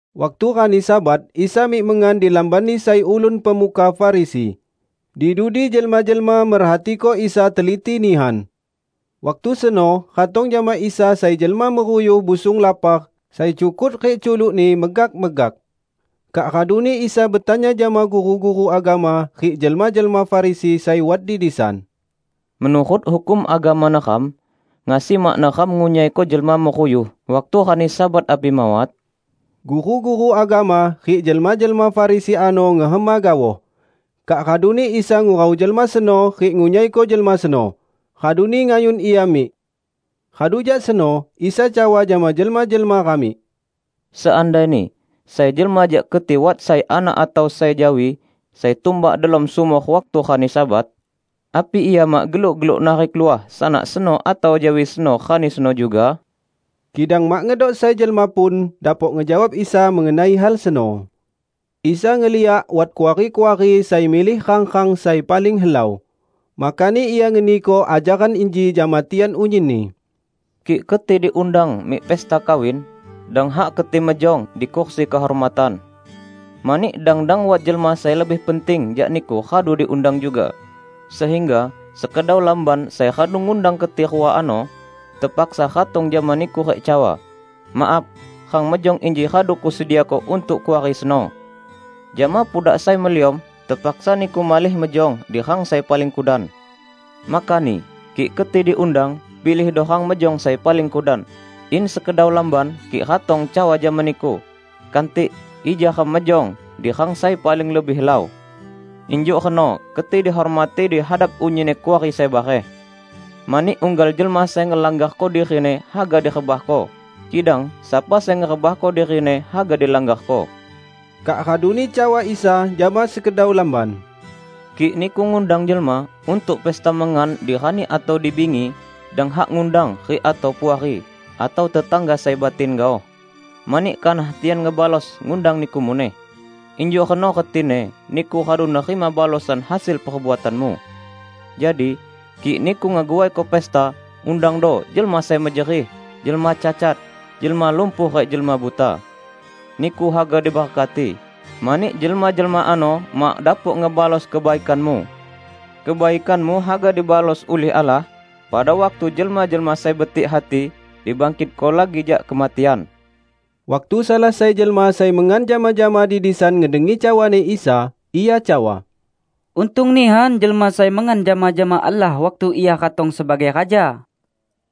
Waktu rani Sabat Isa mik mengan di lambanni sai ulun pemuka Farisi. Di dudi jelma-jelma merhatiko Isa teliti nihan. Waktu seno ratong jama Isa sai jelma meruyuh busung lapar sai cukut rik culukni megak-megak. Kak raduni Isa betanya jama guru-guru agama rik jelma-jelma Farisi sai wat di disan, "Menurut hukum agama neram, ngasi mak neram ngunyaiko jelma meruyuh waktu rani Sabat api mawat?" Guru-guru agama rik jelma-jelma Farisi ano ngehema gaoh. Kak raduni Isa ngurau jelma seno rik ngunyaiko jelma seno, raduni ngayun ia mik. Radu jak seno Isa cawa jama jelma-jelma ramik, "Seandaini sai jelma jak keti wat sai anak atau sai jawi sai tumbak delom sumor waktu rani Sabat, api ia mak geluk-geluk narik luah sanak seno atau jawi seno rani seno juga?" Kidang mak ngedok sai jelma pun dapok ngejawab Isa mengenai hal seno. Isa ngeliak wat kuari-kuari sai milih rang-rang sai paling helau. Makani Ia ngeniko ajaran inji jama tian unyinni. "Kik keti diundang mik pesta kawin, dang hak keti mejong di kursi kehormatan. Mani dang-dang wat jelma sai lebih penting jak niku radu diundang juga, sehingga sekedau lamban sai radu ngundang keti rua ano, tepaksa ratong jama niku rik cawa, 'Maaf, rang mejong inji radu kusediako untuk kuari seno.' Jama pudak sai meliom tepaksa niku malih mejong di rang sai paling kudan. Makani, kik keti diundang, pilihdo rang mejong sai paling kudan, in sekedau lamban kik ratong cawa jama niku, 'Kantik, ija ram mejong di rang sai paling lebih helau.' Injuk reno keti dihormati di hadap unyinni kuari sai bareh. Mani unggal jelma sai ngelanggarko dirini haga direbahko, kidang sapa sai ngerebahko dirini haga dilanggarko." Kak raduni cawa Isa jama sekedau lamban, "Kik niku ngundang jelma untuk pesta mengan di rani atau di bingi, dang hak ngundang rik atau puari, atau tetangga sai batin gaoh. Mani kanah tian ngebalos ngundang niku muneh, injuk reno retini niku radu nerima balosan hasil perbuatanmu. Jadi, kik niku ngeguaiko pesta, undangdo jelma sai mejerih, jelma cacat, jelma lumpuh rik jelma buta. Niku haga diberkati, mani jelma-jelma ano mak dapok ngebalos kebaikanmu. Kebaikanmu haga dibalos ulih Allah pada waktu jelma-jelma sai betik hati dibangkitko lagi jak kematian." Waktu salah sai jelma sai mengan jama-jama di disan ngedengi cawani Isa, ia cawa, "Untung nihan jelma sai mengan jama-jama Allah waktu Ia ratong sebagai Raja!"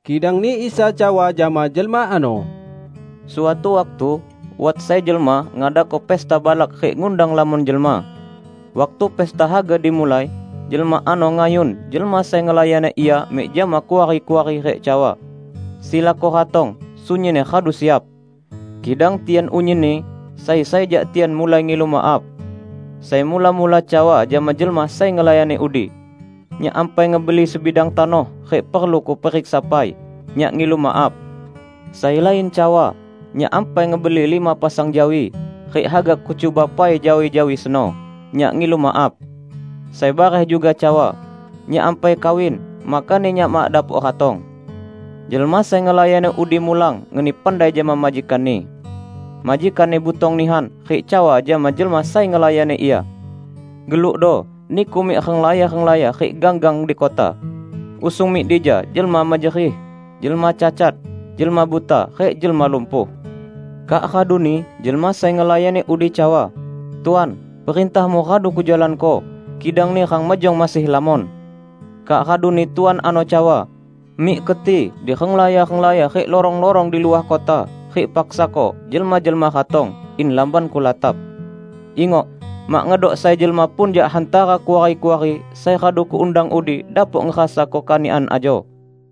Kidangni Isa cawa jama jelma ano, "Suatu waktu wat sai jelma ngadako pesta balak rik ngundang lamon jelma. Waktu pestani haga dimulai, jelma ano ngayun jelma sai ngelayani ia mik jama kuari-kuari rik cawa, 'Silako ratong, sunyinni radu siap!' Kidang tian unyinni, sai-sai jak tian mulai ngilu maaf. Sai mula-mula cawa jama jelma sai ngelayani udi, 'Nyak ampai ngebeli sebidang tanoh rik perlu kuperiksa pai. Nyak ngilu maaf.' Sai lain cawa, 'Nyak ampai ngebeli lima pasang jawi, rik haga kucuba pai jawi-jawi seno. Nyak ngilu maaf.' Sai bareh juga cawa, 'Nyak ampai kawin, makani nyak mak dapok ratong.' Jelma sai ngelayani udi mulang ngeni pandai jama majikanni. Majikanni butong nihan, rik cawa jama jelma sai ngelayani ia, 'Gelukdo niku mik renglaya-renglaya rik gang-gang di kota. Usung mik dija jelma mejerih, jelma cacat, jelma buta rik jelma lumpuh.' Kak raduni jelma sai ngelayani udi cawa, 'Tuan, perintahmu radu kujalanko, kidangni rang mejong masih lamon.' Kak raduni tuan ano cawa, 'Mik keti di renglaya-renglaya rik lorong-lorong di luah kota rik paksako jelma-jelma ratong, in lambanku latap. Ingok! Mak ngedok sai jelma pun jak hantara kuari-kuari sai radu kuundang udi dapok ngerasako kanikan ajo!' "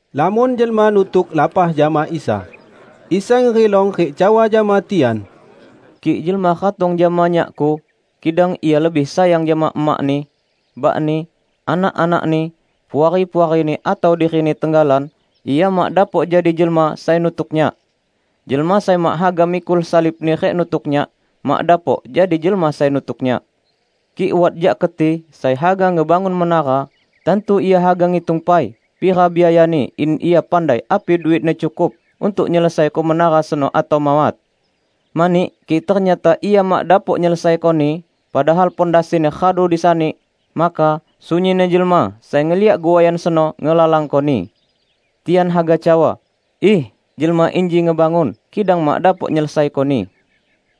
Lamon jelma nutuk lapah jama Isa. Isa ngerilong rik cawa jama tian, "Kik jelma ratong jama Nyak-Ku, kidang ia lebih sayang jama emakni, bakni, anak-anakni, puari-puarini atau dirini tenggalan, ia mak dapok jadi jelma sai nutuk Nyak. Jelma sai mak haga mikul salibni rik nutuk Nyak, mak dapok jadi jelma sai nutuk Nyak. Kik wat jak keti sai haga ngebangun menara, tantu ia haga ngitung pai pira biayani in ia pandai api duitni cukup untuk nyelesaiko menara seno atau mawat. Mani kik ternyata ia mak dapok nyelesaikoni, padahal pondasini radu disani, maka sunyinni jelma sai ngeliak guaian seno ngelalangkoni. Tian haga cawa, 'Iih, jelma inji ngebangun, kidang mak dapok nyelesaikoni!'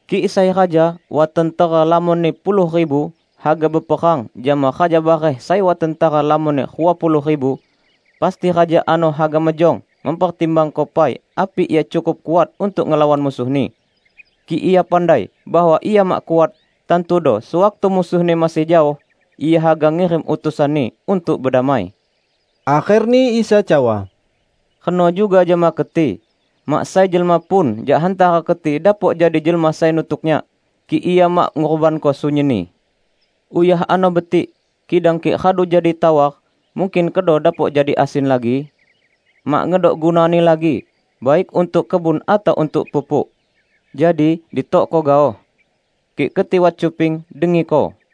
Kik sai raja wat tentera lamonni puluh ribu haga beperang jama raja bareh sai wat tentera lamonni rua puluh ribu, pasti raja ano haga mejong mempertimbangko pai api ia cukup kuat untuk ngelawan musuhni. Kik ia pandai bahwa ia mak kuat, tantudo sewaktu musuhni masih jaoh, ia haga ngirim utusanni untuk bedamai." Akherni Isa cawa, "Reno juga jama keti. Mak sai jelma pun jak hantara keti dapok jadi jelma sai nutuk Nyak, kik ia mak ngurbanko sunyinni." "Uyah ano betik, kidang kik radu jadi tawar, mungkin kedo dapok jadi asin lagi? Mak ngedok gunani lagi, baik untuk kebun atau untuk pupuk. Jadi ditokko gaoh. Kik keti wat cuping, dengiko!"